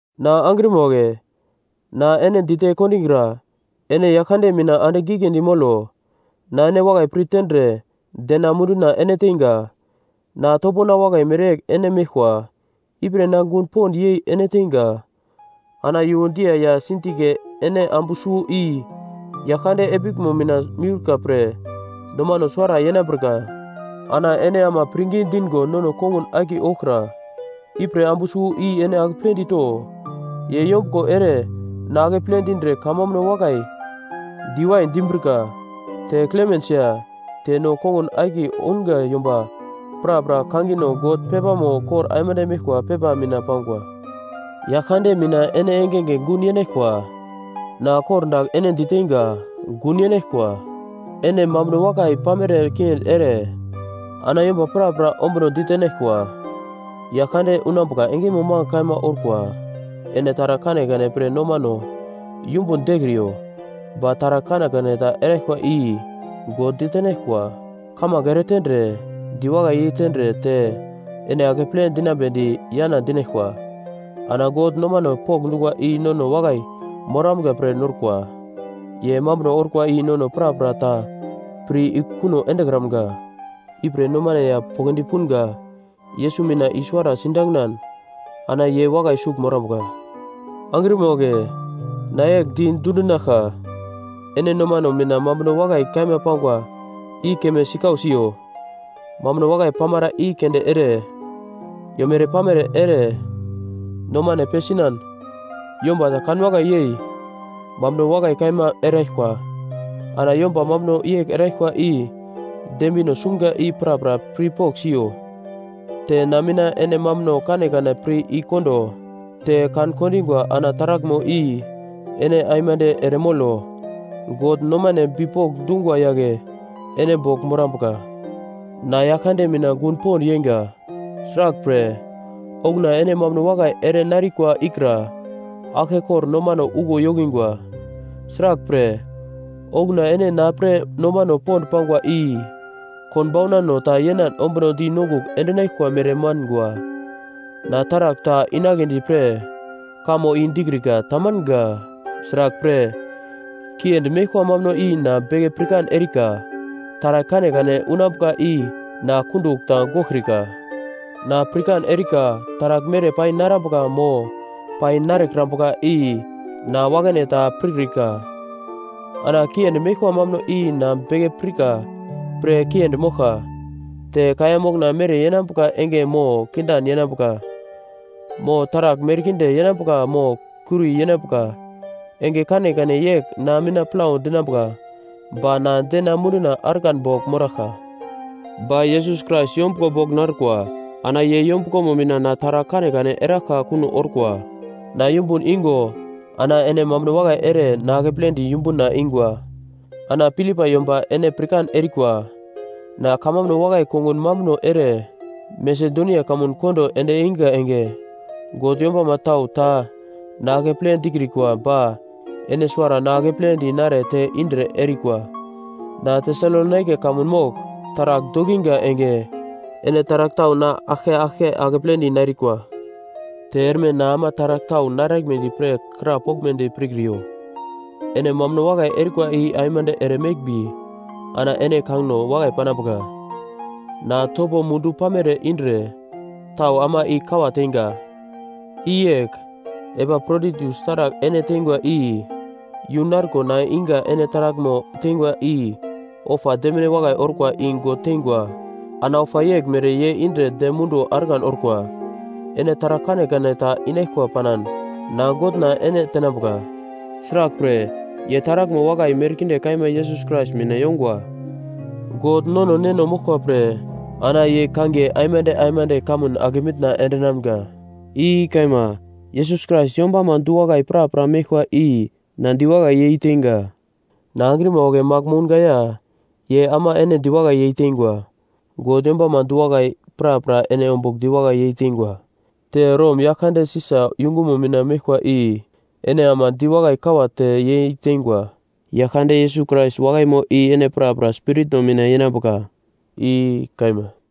Na angrima wagle, na ene dite kondigra ene Yaglkande mina andigl giglendi molo. Na ene wakai pir tendre dena munduna ene teinga. Na topona wakai mereyegl ene meglkwa. Ipre na gun pond yei ene teinga. Ana Yuodiya ya Sintike ene ambu suwo i Yaglkande epiglmo mina miurka pre, nomano suwara yenambrika. Ana ene ama pirngi dingo nono kongun akiye ouglkra, ipre ambu suwo i ene akepledi to. Ye yombuglo ere na akeple dindre kamambuno wakai diwai dimbrika. Te Klemens ya te no kongun akiye ounga yomba prapra kangino God pepamo kor aimande meglkwa pepa mina pangwa. Yaglkande mina ene engenge gun yenaglkwa. Na kor dagl ene diteinga gun yenaglkwa. Ene mambuno wakai pamere kiendi ere ana yomba prapra ombuno ditenaglkwa. Yaglkande unambuka engemo magl kaima orkwa. Ene taragl kanekane pre nomano yumbun dekriyo. Ba taragl kanekane ta eraglkwa i God ditenaglkwa, kamange eretendre, diwakai yei tendre te ene akeple dinambedi yana dinaglkwa. Ana God nomano pokndungwa i nono wakai moramga pre norkwa. Ye mambuno orkwa i nono prapra ta pir i kuno endekramga, ipre nomane ya poglodi punga Yesus mina i-suwara sidanginan ana ye wakai sugl morambuka. Angrima wagle, na yegl di dundinaglka, ene nomano mina mambuno wakai kaima pangwa i keme sikau siyo, mambuno wakai pamara i keunde ere, yomere-pamere ere, nomane pesinan, yomba ta kanwakai yei, mambuno wakai kaima eraglkwa ana yomba mambuno yegl erikwa i dembino sumga i prapra pir pogl siyo. Te na mina ene mambuno kanekane pir i-kondo, te kan-kondingwa ana taraglmo i ene aimande ere molo. God nomane bipok dungwa yagle ene bogl morambuka. Na Yaglkande mina gun pond yeinga, sraglpre, okuna ene mambuno wakai ere narikwa ikra aglke kor nomano uglo yokingwa, sraglpre, okuna ene na pre nomano pond pangwa i konbaunano ta yenan ombunodi nongugl endinaglkwa mere mangwa. Na taragl ta inagledi pre, kamo i dikrika tamanga, sraglpre, kiendi meglkwa mambuno i na beke pirkan erika, taragl kanekane unambuka i na kundugl ta goglkrika. Na pirkan erika taragl mere pai narambuka mo pai narekrambuka i na wakane ta pirkrika, ana kiendi meglkwa mambuno i na beke pirka pre kiendi moglkwa, te kaiya mokna mere yenambuka enge mo kindan yenambuka, mo taragl merkinde yenambuka mo kuri yenambuka enge kanekane yegl na mina plau dinambuka ba na dena munduna argan bogl moraglka. Ba Yesus Krais yombuglo bogl narukwa, ana ye yombuglomo mina na taragl kanekane eraglka kuno orkwa. Na yumbun igo ana ene mambuno wakai ere na akepledi yumbuna ingwa. Ana Filipai yomba ene pirkan erikwa, na kamambuno wakai kongun mambuno ere Masedonia kamun kondo ende einga enge God yombama tau ta na akeple dikrikwa ba ene suwara na akepledi nare te indre erikwa. Na Tesalonaika kamun mogl taragl dokinga enge, ene taragl tau na aglke aglke akepledi narikwa. Te erme na ama taragl tau naraglmedi pre krapoglmedi pirkriyo. Ene mambuno wakai erikwa i aimande ere meglmbi ana ene kangino wakai panambuka. Na topo mundu pamere indre tau ama i-kawa teinga. I yegl, Epaproditus taragl ene teingwa i yu narko na iga ene taraglmo teingwa i ofa demine wakai orkwa i God teingwa ana ofa yeglmere ye indre dem munduwo argan orkwa. Ene taragl kanekane ta inaglkwa panan na Godna ene tenambuka, sraglpre, ye taraglmo wakai merkinde kaima Yesus Krais mina yongwa. God nono Neno moglkwa pre ana ye kangiye aimande aimande kamun ake mitna endinamga. I kaima. Yesus Krais yombama du-wakai prapra meglkwa i na diwakai yeiteinga. Na angrima wagle magl mounga ya ye ama ene diwakai yeiteingwa. God yombama du-wakai prapra ene ombugl diwakai yeiteingwa, te Rom yaglkande Sisa yungumo mina meglkwa i ene ama diwakai kawa te yeiteingwa. Yaglkande Yesus Krais wakaimo i ene prapra spiritno mina yenambuka. I kaima.